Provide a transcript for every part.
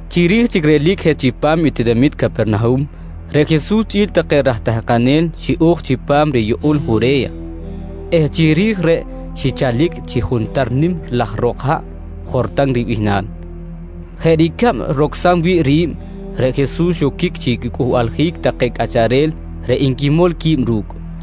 Chiri̱j chic relic je chipam i tinamit Capernahum, reꞌ Jesus chꞌi̱l take raj tahkanel xiꞌo̱j chipam riyukꞌul Jure̱ya eh chiri̱j reꞌ xichalic chi juntar nim laj ro̱k haꞌ Jortan ribihnal. Jeꞌ ricab rocsam wi̱ꞌ ri̱b, reꞌ Jesus xoquic chi quicꞌuhbaljic take cꞌacharel reꞌ nquimol qui̱b ru̱cꞌ.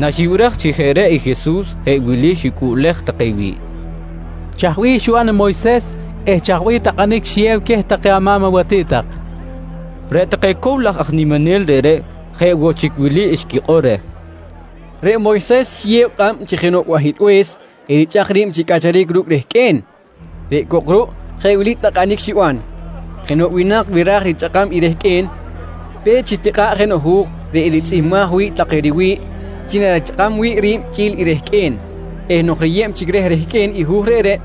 Naxibiraj chi jeꞌ reꞌ i Jesus jeꞌ wili xicꞌuꞌlej take wi̱ꞌ: «Chaj bih xiban i Moyses eh chaj bih takꞌanic xiyew queh take ama̱m awatiꞌt tak? nqui queh. Reꞌ take cow laj aj niminel reꞌreꞌ jeꞌ woꞌ chic wili xquikꞌor reh: «Reꞌ Moyses xiyew kꞌab chi jenoꞌ bahilbe̱s erichꞌak ri̱b chi cꞌacharic ru̱cꞌ rehqꞌue̱n. Reꞌ cok ruꞌ jeꞌ wili takꞌanic xiban: Jenoꞌ winak wi ra̱j richꞌakam i rehqꞌue̱n, pe̱t chitikꞌa̱ꞌ jenoꞌ hu̱j reꞌ eritzꞌihmbaj wi̱ꞌ take riwi̱ꞌ chi narichꞌakam wi̱ꞌ ri̱b chꞌi̱l i rehqꞌue̱n eh nok riyeb chic reh rehqꞌue̱n i hu̱j reꞌreꞌ,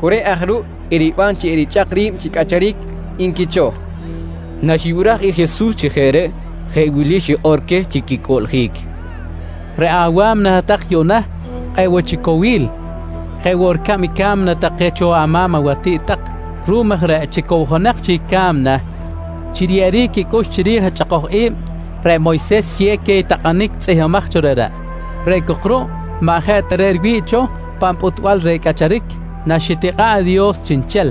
cu reꞌ aj ruꞌ eriban chi erichꞌak ri̱b chi cꞌacharic, nqui cho, nqui take. Naxibiraj i Jesus chi jeꞌ reꞌ, jeꞌ wili xikꞌor queh chi quicꞌuꞌljic: «Reꞌ awa̱mna hat-tak yuꞌna kꞌe̱ꞌ woꞌ chic cowil jeꞌ woꞌ ricab i ca̱mna take xiban cho ama̱m awatiꞌt tak. Ruꞌum aj reꞌ, chi cowjonak chic i ca̱mna chi riyeꞌeric quicꞌux chiri̱j i chꞌakoj i̱b, reꞌ Moyses xiyew queh i takꞌanic tzꞌihmbimaj cho reꞌreꞌ. Reꞌ cok ruꞌ maꞌ jeꞌ ta reꞌ riwi̱ꞌ cho pan pꞌuhtbal reh cꞌacharic naxitikꞌa̱ꞌ i Dios chiꞌnchel.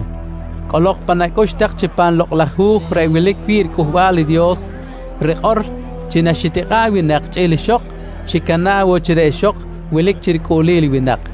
Cꞌolok pan acꞌux tak chi pan Lokꞌ laj Hu̱j reꞌ wilic wi̱ꞌ riCꞌuhbal i Dios rikꞌor chi naxitikꞌa̱ꞌ i winak chꞌi̱l ixok, xicana̱ꞌ woꞌ chi reꞌ ixok wilic chi ricꞌuꞌlil i winak.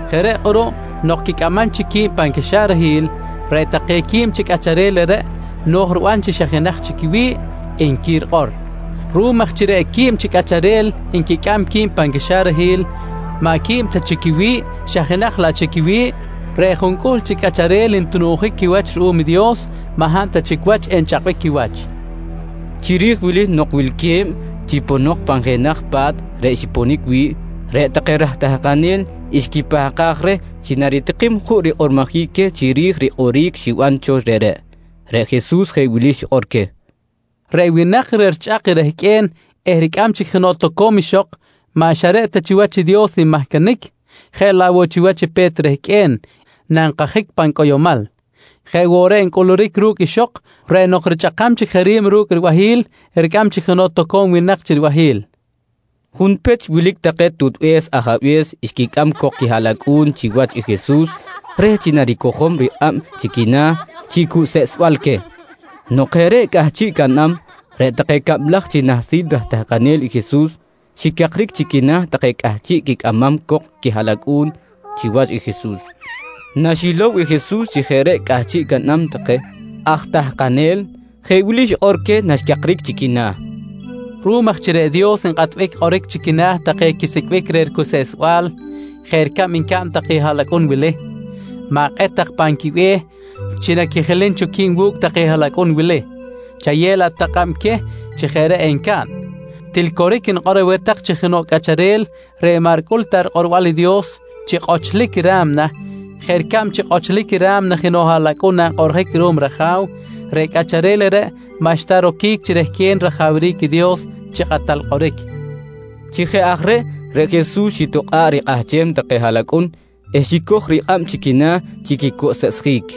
Jeꞌ reꞌ kꞌuruꞌ nok quicꞌamam chic qui̱b pan caxarahil, reꞌ take quib chi cꞌacharel reꞌreꞌ no̱j riban chi xa jenaj chic quiwi̱ꞌ, nqui rikꞌor. «Ruꞌum aj chi reꞌ quib chi cꞌacharel nquicꞌam qui̱b pan caxarahil maꞌ quib ta chic quiwi̱ꞌ xa jenaj laꞌ chic quiwi̱ꞌ reꞌ juncꞌuhl chi cꞌacharel ntununjic quiwach ruꞌum i Dios maꞌ hab ta chic wach enchꞌakbic quiwach, nqui Jesus. Chiri̱j wili nok wilque̱b chi ponok pan jenaj pa̱t reꞌ xiponic wi̱ꞌ, reꞌ take raj tahkanel xquipahkaj reh chi naritikim juꞌ rikꞌormojic queh chiri̱j i kꞌoric xiban cho reꞌreꞌ. Reꞌ Jesus jeꞌ wili xikꞌor queh: «Reꞌ winak reꞌ richꞌak rehqꞌue̱n eh ricꞌam chic jenoꞌ toco̱m ixok maꞌ xa reꞌ ta chiwach i Dios nmahcanic jeꞌ laꞌ woꞌ chiwach i pe̱t rehqꞌue̱n nankajic pan cꞌoyomal. Jeꞌ woꞌ reꞌ ncꞌuluric ru̱cꞌ ixok reꞌ nok richꞌakam chic je ri̱b ru̱cꞌ ribahi̱l, ricꞌam chic jenoꞌ toco̱m winak chi ribahi̱l, nqui Jesus queh. Junpech wilic take tutbe̱s ajabe̱s xquicꞌam cok quihaꞌlacꞌu̱n chiwach i Jesus reh chi naricojom rikꞌab chi quina̱ chi cuseꞌsbal queh. Nok jeꞌ reꞌ cꞌahchiꞌ caꞌnam, reꞌ take cablaj chi nahsil raj tahkanel i Jesus, xicakric chi quina̱ take cꞌahchiꞌ quicꞌamam cok i quihaꞌlacꞌu̱n chiwach i Jesus. Naxilow i Jesus chi jeꞌ reꞌ cꞌahchiꞌ caꞌnam take aj tahkanel, jeꞌ wili xikꞌor queh naxcakric chi quina̱: «Ruꞌum aj chi reꞌ Dios nkꞌatbic kꞌoric chi quina̱ take quisicꞌbic reh ricuseꞌsbal jeꞌ ricab ncaꞌn take haꞌlacꞌun wili, ma̱kꞌet tak pan quibe̱h chi naquijilim cho qui̱b wu̱cꞌ take haꞌlacꞌun wili, chayew laꞌ tak kꞌab queh chi jeꞌ reꞌ encaꞌn. Til coric nikꞌor aweh tak chi jenoꞌ cꞌacharel reꞌ maꞌ ricꞌul ta rikꞌorbal i Dios chi kꞌochlic ra̱mna jeꞌ ricab chi kꞌochlic i ra̱mna jenoꞌ haꞌlacꞌun nankꞌoꞌrjic ruꞌum raja̱w, reꞌ cꞌacharel reꞌreꞌ maꞌxta roquic chi rehquen rajawric i Dios chi kꞌatal kꞌoric, nqui Jesus. Chi jeꞌ aj reꞌ, reꞌ Jesus xitokꞌa̱ꞌ rikꞌahchem take haꞌlacꞌun eh xicoj rikꞌab chi quina̱ chi quicuseꞌsjic.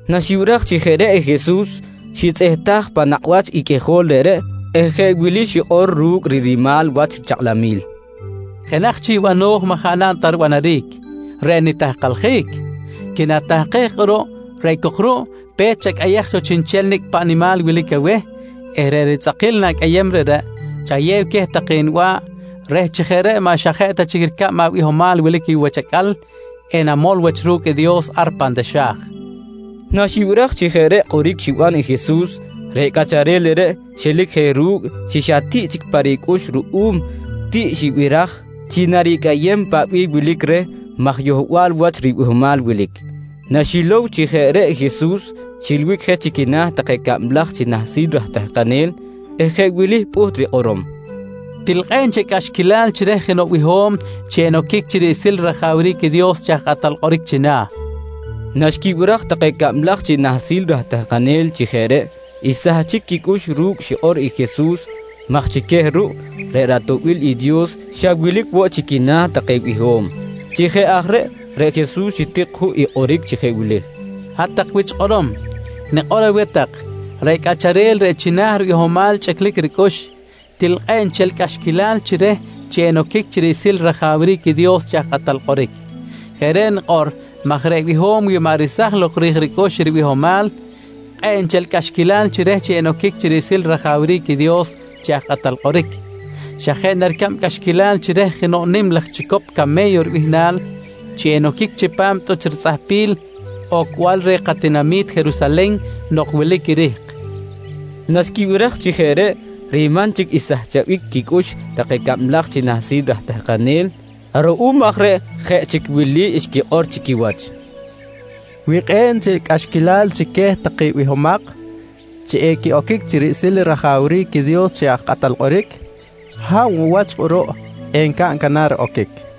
Naxibiraj chi jeꞌ reꞌ i Jesus, xitzꞌehtaj pan nakꞌ wach i qꞌuijol reꞌreꞌ eh jeꞌ wili xikꞌor ru̱cꞌ rinimal wach chakꞌlamil: «Jenaj chic bano̱j maꞌ jaꞌ naꞌn ta ribanaric, reꞌ nitahkaljic. Quinatahkej kꞌuruꞌ reꞌ cok ruꞌ, pe̱t chacꞌayej cho chiꞌnchel nicꞌ paꞌ nimal wilic aweh eh reꞌ ritzꞌakil na̱cꞌayem reꞌreꞌ, chayew queh take niba̱ꞌ reh chi jeꞌ reꞌ maꞌ xa ta jeꞌ chic ricab abihomal wilic ayuꞌ wach acꞌal enamol wach ru̱cꞌ i Dios ar pan taxa̱j, nqui Jesus. Naxibiraj chi jeꞌ reꞌ kꞌoric xiban i Jesus, reꞌ cꞌacharel reꞌreꞌ xelic je ru̱cꞌ chi xa tiꞌ chic pa ricꞌux ruꞌum tiꞌ xibiraj chi naricꞌayem paꞌ bih wilic reh maj yohbal cho wach ribihomal wilic. Naxilow chi jeꞌ reꞌ i Jesus, xilbic je chi quina̱ take cablaj chi nahsil raj tahkanel eh jeꞌ wili pꞌuht rikꞌorom: «Til kꞌe̱ꞌ nchel cꞌaxquilal chi reh jenoꞌ biho̱m chi enoquic chi riꞌsil rajawric i Dios chi aj kꞌatal kꞌoric china̱, nqui queh. Naxquibiraj take cablaj chi nahsil raj tahkanel chi jeꞌ reꞌ, xsahchic quicꞌux ru̱cꞌ xikꞌor i Jesus maj chi queh ruꞌ, reꞌ ratoꞌbil i Dios xa wilic woꞌ chi quina̱ take biho̱m. Chi jeꞌ aj reꞌ, reꞌ Jesus xitik juꞌ i kꞌoric chi jeꞌ wili: «Hat-tak wich kꞌorom, nikꞌor aweh tak, reꞌ cꞌacharel reꞌ china̱ ribihomal chꞌiclic ricꞌux, til kꞌe̱ꞌ nchel cꞌaxquilal chi reh chi enoquic chi riꞌsil rajawric i Dios chi aj kꞌatal kꞌoric. Jeꞌ reꞌ nikꞌor maj reꞌ biho̱m wi maꞌ resaj lok rij ricꞌux i ribihomal, kꞌe̱ꞌ nchel cꞌaxquilal chi reh chi enoquic chi riꞌsil rajawric i Dios chi aj kꞌatal kꞌoric. Xa jeꞌ na ricab cꞌaxquilal chi reh jenoꞌ nim laj chicop came̱yo ribihnal, chi enoquic chipam tꞌuch ritzꞌahpil ocbal reh katinami̱t Jerusalen nok wilic i rihk, nqui Jesus. Naxquibiraj chi jeꞌ reꞌ, riman chic xsahchabic quicꞌux take cablaj chi nahsil raj tahkanel. Ruꞌum aj reꞌ jeꞌ chic wili xquikꞌor chi quiwach: «Wi kꞌe̱ꞌ nchel cꞌaxquilal chi queh take bihomak chi equiꞌoquic chi riꞌsil rajawric i Dios chi aj kꞌatal kꞌoric, hab woꞌ wach kꞌuruꞌ encaꞌn canar oquic? nqui take.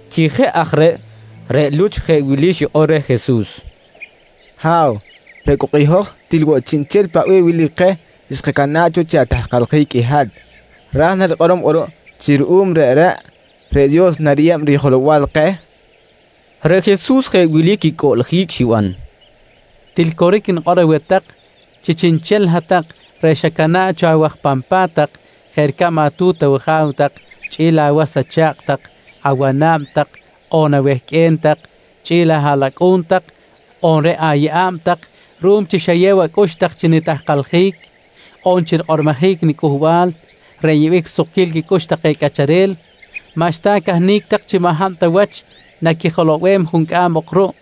Chi jeꞌ aj reꞌ, reꞌ Luch jeꞌ wili xikꞌor reh Jesus: «Ha̱w, reꞌ cok i hoj til woꞌ chiꞌnchel paꞌ bih wilic keh xkacana̱ꞌ cho chi atahkaljic i hat. Ra̱j na rikꞌorom kꞌuruꞌ chi ruꞌum reꞌreꞌ, reꞌ Dios nariyeb rijelow-bal keh? nqui reh. Reꞌ Jesus jeꞌ wili quicꞌuꞌljic xiban: «Til coric nikꞌor aweh tak chi chiꞌnchel hat-tak reꞌ xacana̱ꞌ cho awaj pan pa̱t tak jeꞌ ricab atu̱t awaja̱w tak chꞌi̱l awas acha̱kꞌ tak, awana̱b tak on awehqꞌue̱n tak chꞌi̱l ahaꞌlacꞌu̱n tak on reꞌ ayeꞌa̱b tak ruꞌum chi xayew acꞌux tak chi nitahkaljic on chi rikꞌormojic niCꞌuhbal reꞌ nyeꞌbic risukquil quicꞌux take cꞌacharel, maꞌxta acahnic tak chi maꞌ ta hab wach naquijilow-bem juncꞌam ok ruꞌ.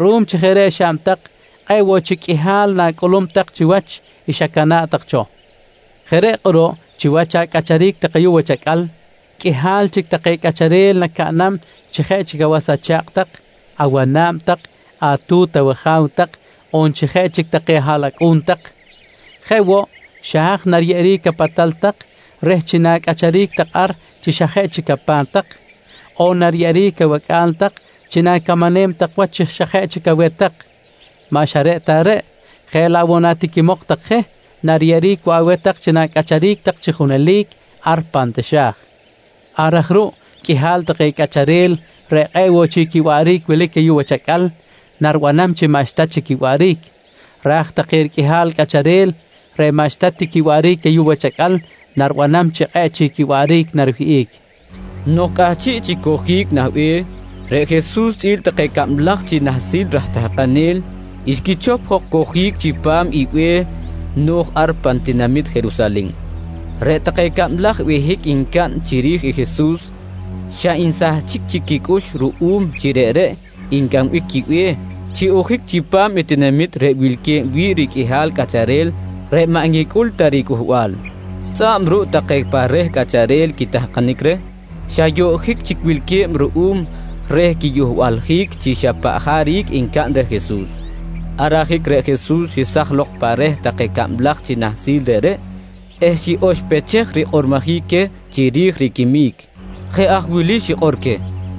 Ruꞌum chi jeꞌ reꞌ xaꞌn tak, kꞌe̱ꞌ woꞌ chic qꞌuihal na̱cꞌulum tak chiwach i xacana̱ꞌ tak cho. Jeꞌ reꞌ kꞌuruꞌ chiwach acꞌacharic tak ayuꞌ wach acꞌal, qꞌuihal chic take cꞌacharel nacaꞌnam chi jeꞌ awas acha̱kꞌ tak, awana̱b tak, atu̱t awaja̱w tak on chi jeꞌ chic take ahaꞌlacꞌu̱n tak. Jeꞌ woꞌ xa haj nariyeꞌeric apatal tak reh chi na̱cꞌacharic tak ar chi xa jeꞌ chic apa̱t tak, on nariyeꞌeric awacꞌa̱l tak chi na̱camanem tak wach chi jeꞌ chic aweh tak. Maꞌ xa ta reꞌreꞌ, jeꞌ laꞌ woꞌ natiquimok tak je nariyeꞌeric woꞌ aweh tak chi na̱cꞌacharic tak chi junelic ar pan taxa̱j. Ar aj ruꞌ qꞌuihal take cꞌacharel reꞌ kꞌe̱ꞌ woꞌ chic quiwaꞌric wilic ayuꞌ wach acꞌal, naribanam chi maꞌxta chic quiwaꞌric. Ra̱j take riqꞌuihal cꞌacharel reꞌ maꞌxta ti quiwaꞌric ayuꞌ wach acꞌal, naribanam chi kꞌe̱ꞌ chic quiwaꞌric nariwihꞌic, nqui Jesus. Nok cꞌahchiꞌ chic cojic nah be̱h, reꞌ Jesus chꞌi̱l take i cablaj chi nahsil raj tahkanel xquichop jok kojic chipam i be̱h no̱j ar pan tinamit Jerusalen. Reꞌ take cablaj behic ncaꞌn chiri̱j i Jesus, xa nsahchic chic quicꞌux ruꞌum chi reꞌreꞌ ncꞌambic quibe̱h chi ojic chipam i tinamit reꞌ wilque̱b wi̱ꞌ riqꞌuihal cꞌacharel reꞌ maꞌ nquicꞌul ta riCꞌuhbal. Tzꞌa̱b ruꞌ take pa reh chic cꞌacharel quitahkanic reh, xa yoꞌjic chic wilque̱b ruꞌum reh riyohbaljic chi xa paꞌ jaric encaꞌn reh Jesus. Ar ajic reꞌ Jesus xesaj lok pa reh take cablaj chi nahsil reꞌreꞌ eh xiꞌoxpechej rikꞌormojic queh chiri̱j riquimic. Jeꞌ aj wili xikꞌor queh: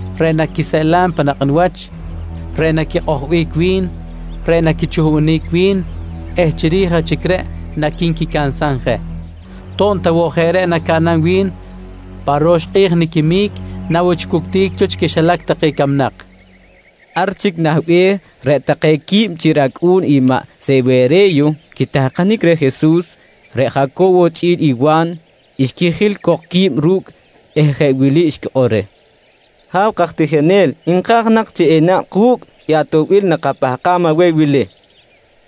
reꞌ naquiseꞌlam pan nakꞌ niwach, reꞌ naquikꞌojbic wi̱n, reꞌ naquichuhbunic wi̱n eh chiri̱j aj chic reꞌ naqui̱nquicansam je. To̱b ta woꞌ jeꞌ reꞌ nacaꞌnam wi̱n, pa ro̱x kꞌi̱j niquimic na woꞌ chic wuctic cho chi quixilac take camnak, nqui Jesus. Ar chic nah be̱h, reꞌ take quib chi racꞌu̱n i maꞌ Sewere̱yo quitahkanic reh Jesus, reꞌ Jaco̱wo chꞌi̱l i Wa̱n, xquijil cok qui̱b ru̱cꞌ eh jeꞌ wili xquikꞌor reh: «Ha̱w kaj tijinel, nka̱j nak chi enaꞌn ku̱cꞌ i atoꞌbil nakapahkam aweh wili, nqui take reh.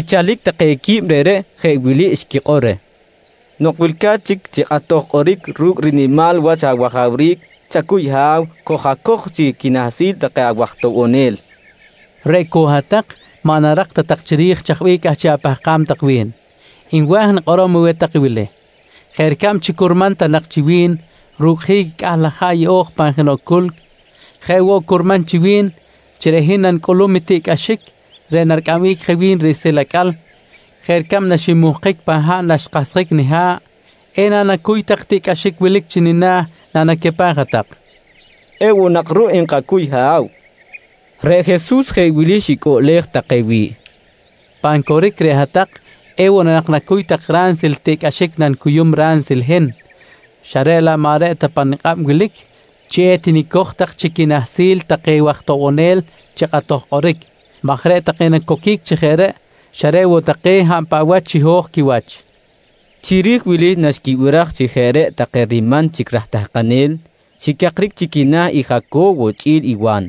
Xichalic take quib reꞌreꞌ jeꞌ wili xquikꞌor reh: «Nok wilca̱t chic chi kꞌatoj kꞌoric ru̱cꞌ rinimal wach awajawric, chacuy Ha̱w, koj-acoj chi quinahsil take awaj toꞌbonel, nqui take reh. —Reꞌ cok hat-tak maꞌ narak ta tak chiri̱j chaj bih cꞌahchiꞌ apahkam tak wi̱n. Nwa̱j nikꞌorom aweh tak i wili: Jeꞌ ricab chi curman ta nak chi wi̱n rucꞌjic i cꞌah laj haꞌ yeꞌo̱j pan jenoꞌ culc, jeꞌ woꞌ curman chi wi̱n chi reꞌ hin nanicꞌulum i tiꞌcꞌaxic reꞌ naricꞌambic je wi̱n riꞌsil acꞌal jeꞌ ricab naxinmuhkic pan haꞌ naxkahsjic niha̱ꞌ. Ena nacuy tak i tiꞌcꞌaxic wilic chi nina̱ nanacapaj hat-tak? nqui queh. —Ewoꞌ nak ruꞌ nkacuy Ha̱w, nqui take. Reꞌ Jesus jeꞌ wili xicꞌuꞌlej take wi̱ꞌ: «Pan coric, reꞌ hat-tak ewoꞌ na nak nacuy tak ransil i tiꞌcꞌaxic nanicuyum ransil i hin, xa reꞌ laꞌ maꞌ reꞌ ta pa nikꞌab wilic chi etinicoj tak chi quinahsil take waj toꞌbonel chi kꞌatoj kꞌoric maj reꞌ take nacoquic chi jeꞌ reꞌ, xa reꞌ woꞌ take hab paꞌ wach chiho̱j quiwach, nqui Jesus queh. Chiri̱j wili naxquibiraj chi jeꞌ reꞌ take riman chic aj tahkanel, xicakric chi quina̱ i Jaco̱wo chꞌi̱l i Wa̱n.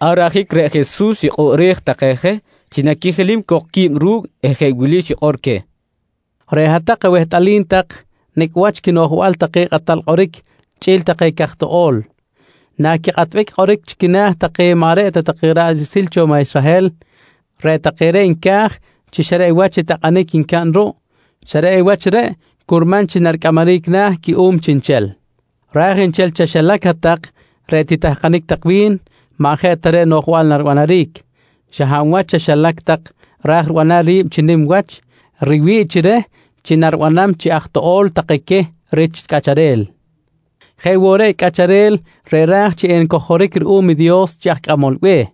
Ar ajic reꞌ Jesus xikꞌoꞌrej take je chi naquijilim cok qui̱b ru̱cꞌ eh jeꞌ wili xikꞌor queh: «Reꞌ hat-tak awehtꞌalim tak nicꞌ wach quinoꞌjbal take kꞌatal kꞌoric chꞌi̱l take caj toꞌo̱l, naquikꞌatbic kꞌoric chi quina̱ take maꞌ reꞌ ta ra̱ꞌ riꞌsil cho maꞌ Israhel. Reꞌ take reꞌ nca̱j chi xa reꞌ wach i takꞌanic ncaꞌn ruꞌ, xa reꞌ wach reꞌ curman chi naricꞌamaric na̱ cuꞌum chiꞌnchel. Ra̱j nchel chaxilac hat-tak reꞌ titahkanic tak wi̱n maꞌ jeꞌ ta reꞌ i noꞌjbal naribanaric. Xa hab wach chaxilac tak ra̱j ribanam ri̱b chi nim wach, riwi̱ꞌ chi reh chi naribanam chi aj toꞌo̱l take queh rich cꞌacharel. Jeꞌ woꞌ reꞌ i cꞌacharel reꞌ ra̱j chi encojoric ruꞌum i Dios chi aj cꞌamol be̱h,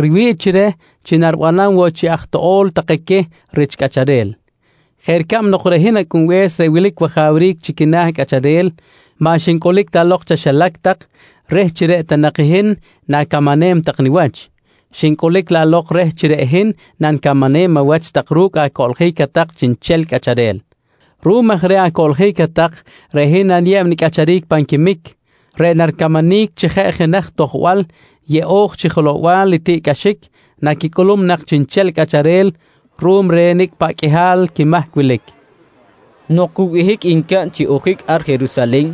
riwi̱ꞌ chi reh chi naribanam woꞌ chi aj toꞌo̱l take queh rich cꞌacharel jeꞌ ricab nok reꞌ hin Acꞌunbe̱s reꞌ wilic wajawric chi quina̱ cꞌacharel, maꞌ xincꞌulic ta lok chaxilac tak reh chi reꞌ ta nak hin na̱camanem tak niwach, xincꞌulic laꞌ lok reh chi reꞌ hin nanicamanem awach tak ru̱cꞌ acoꞌljic hat-tak chiꞌnchel cꞌacharel. Ruꞌum aj reh acoꞌljic hat-tak, reꞌ hin naniyeb nicꞌacharic pan quimic reꞌ naricamanic chi jeꞌ jenaj tojbal yeꞌo̱j chi rijelow-bal i tiꞌcꞌaxic naquicꞌulum nak chiꞌnchel cꞌacharel ruꞌum reh nicꞌ paꞌ qꞌuihal quimahc wilic, nqui Jesus. Nok cu behic ncaꞌn chi ojic ar Jerusalen,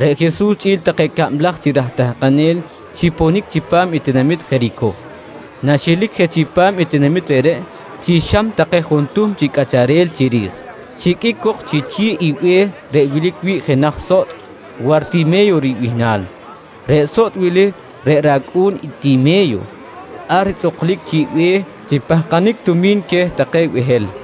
reꞌ Jesus chꞌi̱l take cablaj chi raj tahkanel xiponic chipam i tinamit Jericoh. Naxelic je chipam i tinamit reꞌreꞌ chi xam take juntuhm chi cꞌacharel chiri̱j, xiqꞌuic cok chi chi̱ꞌ i be̱h reꞌ wilic wi̱ꞌ jenaj sotꞌ Wartime̱yo ribihnal. Reꞌ sotꞌ wili reꞌ racꞌu̱n i Time̱yo, ar tzꞌuklic chiꞌ be̱h chi pahkanic tumi̱n queh take behel.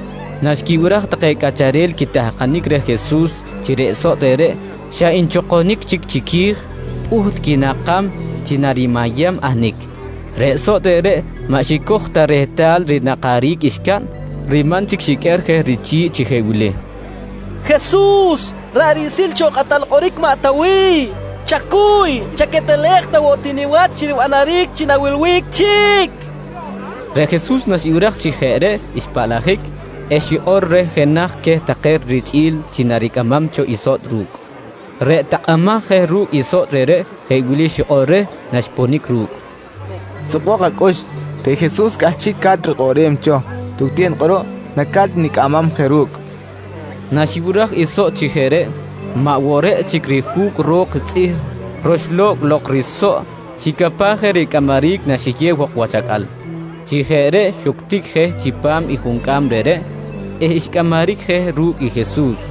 Naxquibiraj take cꞌacharel quitahkanic reh Jesus chi reꞌ sotꞌ reꞌreꞌ xa nchokonic chic chiqui̱j, pꞌuht quinakam chi narimayam ahnic. Reꞌ sotꞌ reꞌreꞌ maꞌ xicoj ta rehtal rinakaric xcaꞌn, riman chic xiqꞌuer je richi̱ꞌ chi jeꞌ wili: «Jesus ra̱ꞌ riꞌsil cho kꞌatal kꞌoric maꞌ Tawiy, chacuy chaquetelej ta woꞌ ti niwach chi ribanaric chi na̱wilbic chic, nqui reh. Reꞌ Jesus naxibiraj chi jeꞌ reꞌ xpaꞌlajic eh xikꞌor reh jenaj queh take richꞌi̱l chi naricꞌamam cho i sotꞌ ru̱cꞌ. Reꞌ takꞌamaj je ru̱cꞌ i sotꞌ reꞌreꞌ jeꞌ wili xikꞌor reh naxponic ru̱cꞌ: «Sukbok acꞌux. Reꞌ Jesus cꞌahchiꞌca̱t rikꞌoꞌrem cho. Tucten kꞌuruꞌ, naca̱t nicꞌamam je ru̱cꞌ, nqui reh. Naxibiraj i sotꞌ chi jeꞌ reꞌ, maꞌ woꞌ reꞌ chic i rijuc ro̱k tzꞌih roxlo̱cꞌ lok risoꞌ xicapaj je ricꞌamaric naxiyew jok wach acꞌal. Chi jeꞌ reꞌ xuctic ti je chipam i juncꞌam reꞌreꞌ eh xcꞌamaric je ru̱cꞌ i Jesus.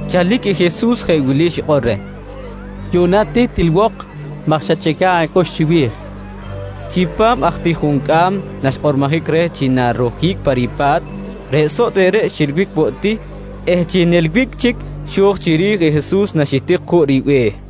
Chalic i Jesus jeꞌ wili xikꞌor reh: «Yuꞌna ti tilwok maj xachꞌica̱ꞌ acꞌux chiwi̱j, nqui reh. Chipam aj ti juncꞌam naxkꞌormojic reh chi narojic pa ripa̱t, reꞌ sotꞌ reꞌreꞌ xilbic woꞌ ti eh chi nilbic chic, xo̱j chiri̱j i Jesus naxitik juꞌ ribe̱h.